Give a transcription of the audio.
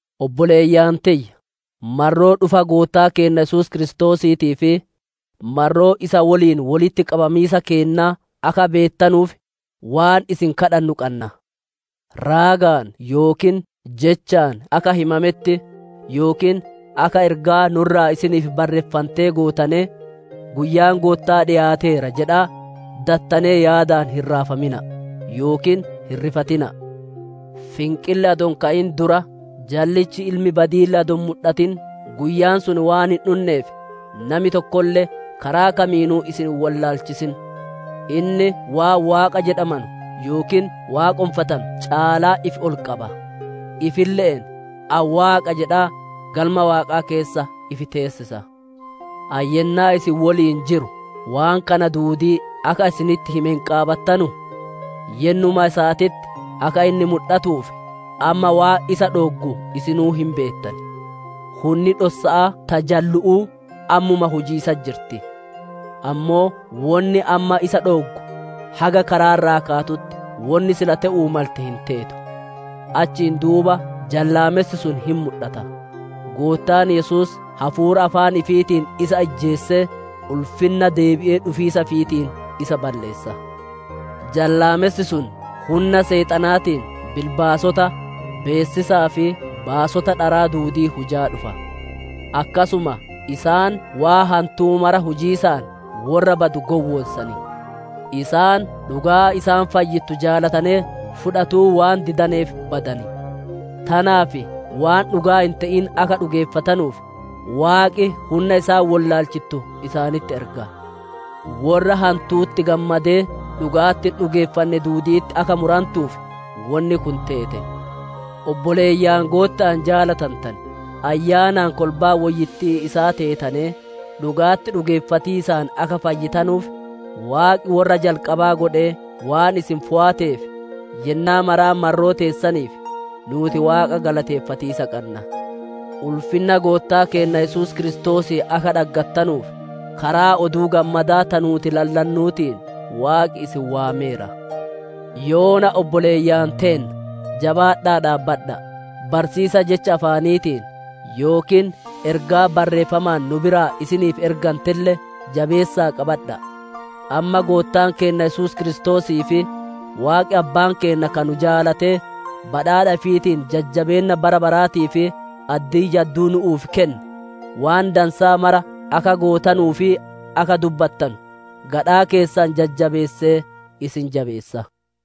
Obboleeyyan tiyya! Marroo dhufa Goottaa keenna Yesuus Kiristoosiitii fi marroo isa woliin wolitti qabamiisa keennaa akka beettanuuf, waan isin kadhannu qanna: raagaan yookiin jechaan akka himametti, yookiin akka ergaa nu'u irraa isiniif barreeffantee gootanee «Guyyaan Gootta'aa dhiyaateera» jedhaa dattanee yaadaan hin raafamina'a, yookiin hin rifatina'a. Finqilli adoo hin ka'in dura jallichi ilmi badi'iille adoo hin mudhatin guyyaan sun waan hin dhunneef, nami tokkolle karaa kamiinuu isin hin wollaalchisin. Inni waan waaqa jedhamanu yookiin waaqonfatanu caalaa ifi ol qaba; ifille'een, «Ani Waaqa» jedhaa Galma Waaqaa keessa ifi teessisa. Ani yennaa isin woliin jiru waan kana duudii akka isinitti hime hin qaabattanuu? Yennuma isaatitti akka inni mudhatuuf amma waan isa dhooggu isinuu hin beettan. Hunni dhossa'aa ta jallu'uu ammumaa hujiisatti jirti; ammoo wonni amma isa dhooggu haga karaa irraa kaatutti wonni sila te'uu malte hin teetu. Achiin duuba jallaamessi sun hin mudhata; Goottaan Yesuus hafuura afaan ifiitiin isa ijjeesee, ulfinna deebi'ee dhufiisa ifiitiin isa balleessa. Jallaamessi sun hunna Seexanaatiin bilbaasota, beessisaa fi baasota dharaa duudii hujaa dhufa. Akkasuma isaan waan hantuu mara hujiisaan worra badu gowwoonsan. Isaan dhugaa isaan fayyittu jaalatanee fudhatuu waan didaneef badan. Tanaaf waan dhugaa hin te'in akka dhugeeffatanuuf, Waaqi hunna isaan wollaalchittu isaanitti erga. Worra hantu'utti gammadee dhuga'atti hin dhugeeffanne duudi'itti akka murantuuf, wonni kun teete. Obboleeyyan Gootta'aan jaalatantane, Ayyaanaan kolbaa woyyittii isaa teetanee, dhuga'atti dhugeeffatiisaan akka fayyitanuuf Waaqi worra jalqabaa godhee waan isin fooyateef, yennaa maraa marroo teessaniif, nuuti Waaqa galateeffatiisa qanna. Ulfinna Goottaa keenna Yesuus Kiristoosii akka dhaggattanuuf, karaa Oduu Gammadaa ta nuuti lallannuutiin Waaqi isin waameera. Yoona obboleeyyan teenna, jabaadha'aa dhaabbadha'a; barsiisa jecha afaaniitiin yookiin ergaa barreeffamaan nu biraa isiniif ergantelle jabeessa'aa qabadha'a. Amma Goottaan keenna Yesuus Kiristoosii fi Waaqi Abbaan keenna ka nu jaalatee, badhaadha ifiitiin jajjabeenna bara baraatii fi addii jadduu nu'uuf kenne, waan dansaa mara akka gootanuu fi akka dubbattanu gadhaa keessan jajjabeessee, isin jabeessa.